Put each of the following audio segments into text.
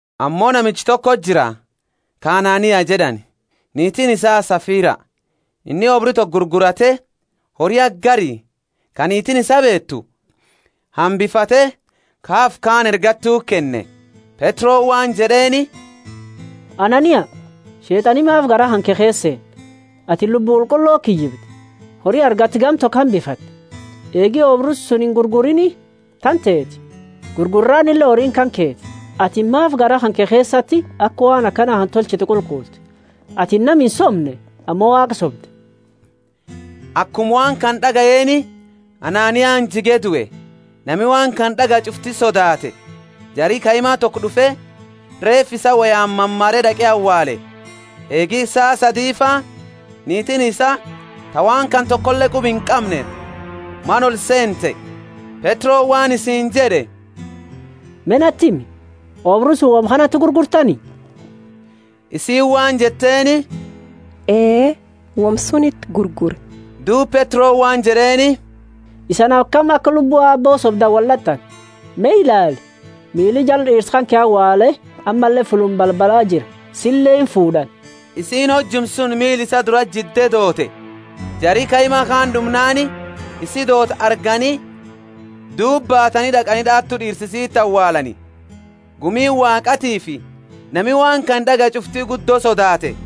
Ammo namicha toko jira, ka Anania jed'ani, niitiini isaa Safira. Inni oobru toko gurgurate, hori haga gari, ka niitiini isaa beetu, hambifate, ka hafe kaani ergattuti kenne. Petroni waan jed'eeni, Anania, Sheet'ani maafi garaa kanke keesa seene, atini Lubbu Qulqulloti kiyyibde, hori argatte gama toko hambifatte? Eegi oobru suni ingurguriini tanteti, gurgurraanile horiini kanketi. Atini maafi garaa kanke keesati aka waan kana tolchitu qulqulte? Atini nama insoomne ammo Waaqa sobde! Akuma waan kana d'agayeeni, Ananiani jige due; nami waan kana d'agaye ch'ufti sodaate. Jari kaima toko d'ufe, reefa isaa woyaani mamare d'aqe awaale. Eegi saa sadifa niitiini isaa, ta waan kana tokole quba inqamne, mana olseente. Petroni waan isiini jed'e, Me nati himi, oobru suni woma kanati gurgurtani? Isiini waan jetteeni, Ee, woma suniti, gurgurre. Duuba Petroni waan jed'eeni, isani akami aka lubbu Aabbo sobdani wold'at'ani? Me ilaali, miili jara d'iirsa kanke awaale ammalle fulluma balbala jira, sile imfuud'ani. Isiini hojuma suni miila isaa durati jidde doote. Jari kaima kaani olduunnaani isi doote argani duuba baatani d'aqani d'awatu d'iirsa isiti awaalani. Gumi Waaqatiifi nami waan kana d'agaye ch'ufti guddo sodaate.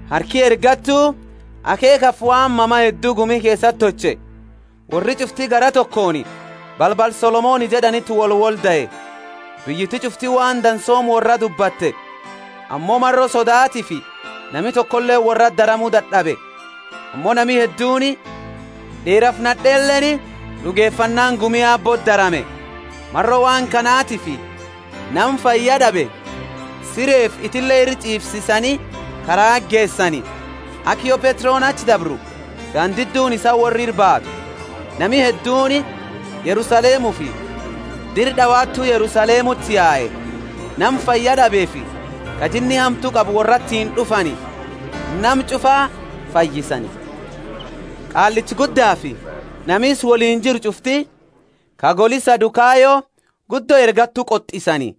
Harki ergattu akheekhafi waan mama heddu gumi keesati tolche. Worri ch'ufti garaa tokooni balbala Solomoni jed'aniti wolwoldae. Biyyiti ch'ufti waan dansuma worraa dubbate, ammo maro sodaatiifi nami tokoleeni worraati daramu dad'abe. Ammo nami hedduuni, d'iirafi nad'eenileeni d'ugefannaani gumi Aabbooti darame. Maro waan kanatifi nama fayyad'abe sireefi itile ira ch'iifsisani karaati geesani, aka yo Petroni achi dabru gandiduni isaa worra ira baatu. Nami hedduuni Yerusalemufi dira d'awatu Yerusalemuti yae, nama fayyad'abefi ka jinni hamtu qabu worratiini d'ufani; nama ch'ufa fayyisani. Qaallicha Guddafi nami isa woliini jiru ch'ufti, ka goli Sadukayo, guddo ergattu qot'isani,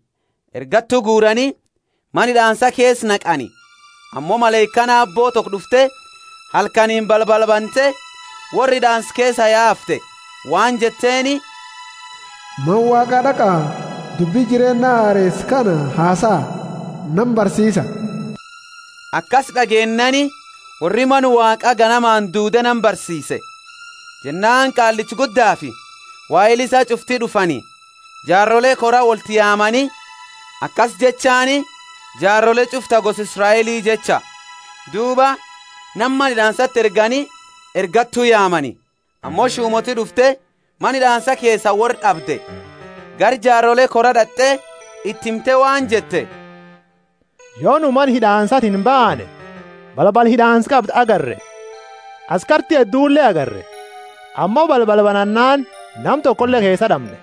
ergattu guurani, mana hid'aansa keesa naqani. Ammo malaikaani Aabbo toko d'ufte, halkani balbala bante, worra hid'aansa keesaa yaafte, waan jetteeni, Beena, Mana Waaqa d'aqa, dubbi jireenna hareesa kana hasaa, nama barsiisa. Akasi d'ageennaani worri Mana Waaqa ganamaani duude nama barsiise. Jennaani Qaallicha Guddafi waheli isaa ch'ufti d'ufani, jaarole kora wolti yaamani, akasi jechaani jaarole ch'ufa ta gosa Israeli jecha; duuba nama mana hid'aansati ergani, ergattu yaamani. Ammo shumooti d'ufte mana hid'aansa keesaa worra d'abde, gara jaarole koraa d'at'e iti himte waan jette, Yo nu mana hid'aansatiini baane, balbala hid'aansa qabdu agarre, askarti eedule agarre, ammo balbala banannaani nama tokole keesa d'amne.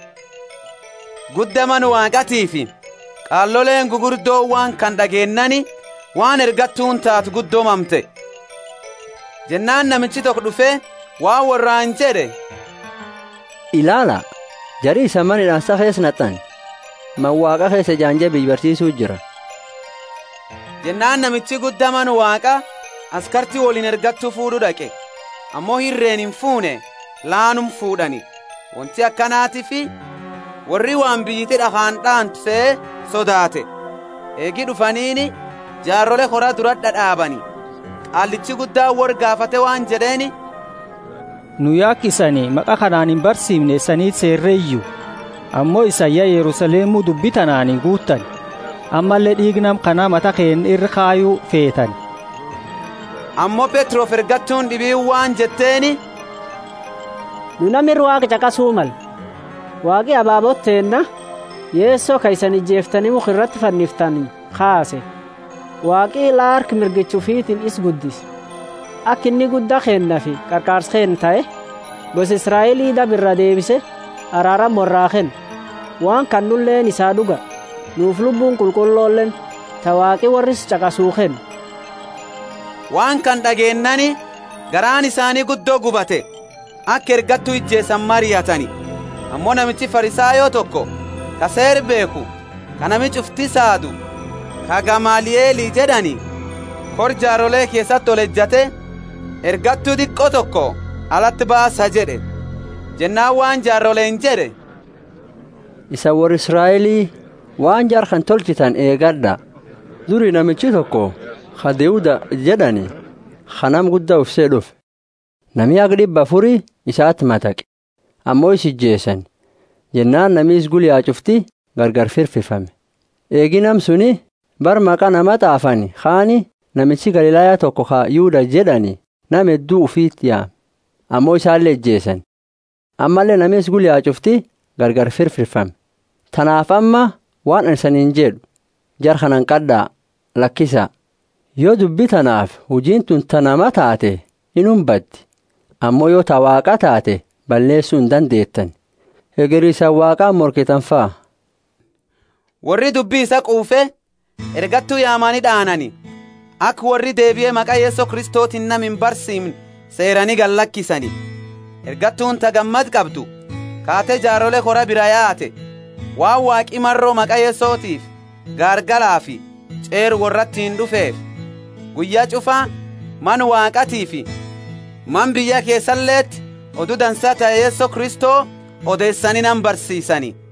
Gudda Mana Waaqatiifi qaaloleeni gugurdooni waan kana d'ageennaani waan ergattuuni taate guddo mamte. Jennaani namichi toko d'ufe waan worraani jed'e, Ilaala, jari isani mana hid'aansa keesa nat'ani, Mana Waaqa keesa ejaanje biyya barsiisu jira jed'e. Jennaani namichi gudda Mana Waaqa askarti woliini ergattu fuud'u d'aqe, ammo irreeni infuune laanuma fuud'ani, wonti akanatiifi worri waan biyyiti d'akhaani d'aantu sehe sodaate. Eegi d'ufaniini jaarole kora dura d'ad'aabani, Qaallichi Guddaani worra gaafate waan jed'eeni, Nu ya aka isani maqa kanaani imbarsiimne isaniti seereeyu? Ammo isani ya Yerusalemu dubbi tanaani guuttani, ammalle d'iiga nama kana mata keenna ira kayu feetani! Ammo Petrofi ergattuuni d'ibiini waan jetteeni, Nu nama ira Waaqa ch'aqasu malle. Waaqi ababoota teenna, Yeso ka isani ijeeftani mukha irati fanniftani kaase. Waaqi la harka mirgicha ufitiini isa guddise, aka inni Gudda keennafi Qarqaarsa keenna tahe, gosa Israeli daba iraa deebise araarama worraa kennu. Waan kana nuleeni isaa d'uga, nufi Lubbuuni Qulqulloleeni, ta Waaqi worra isa ch'aqasu kennu. Waan kana d'ageennaani garaani isaani guddo gubate, aka ergattu ijeesani mariatani. Ammo namichi Farisayo toko, ka Seera beekhu, ka nami ch'ufti saadu, ka Gamalieli jed'ani, kora jaarole keesati olejate, Ergattu diqo toko alati baasa jed'e. Jennaani waan jaaroleeni jed'e, Isani worra Israeli, waan jara kana tolchitani eegad'a. Duri namichi toko ka Theuda jed'ani, ka nama gudda ufi sehe, d'ufe, nami haga d'ibba afuri isati mataqe. Ammo isa ijeesani, jennaani nami isa gula yae ch'ufti gargari firfirfame. Eegi nama suni, bara maqa nama t'aafani kaani namichi Galilaya toko ka Yuda jed'ani, nama heddu ufiti yaame. Ammo isale ijeesani, ammalle nami isa gula yau ch'ufti gargari firfirfame. Tanaafi amma waan anini isaniini jed'u, Jara kana hanqad'a, lakisa. Yo dubbi tanaafi hujiini tuni ta namaa taate inuma baddi; ammo yo ta Waaqaa taate balleesu indandeetani. Hegeri isani Waaqaani morkitanifa. Worri dubbi isaa quufe, ergattu yaamani d'aanani, aka worri deebie maqa Yeso Kristotiini nama imbarsiimne seeraani gallakisani. Ergattuuni ta gammada qabdu kaate jaarole kora biraa yaate, waan Waaqi maro maqa Yesotiifi gaargalafi ch'eera worratiini d'ufeefi. Guyya ch'ufa Mana Waaqatiifi mana biyya keesaleti Odu Dansa ta Yeso Kristo odeesani nama barsiisani.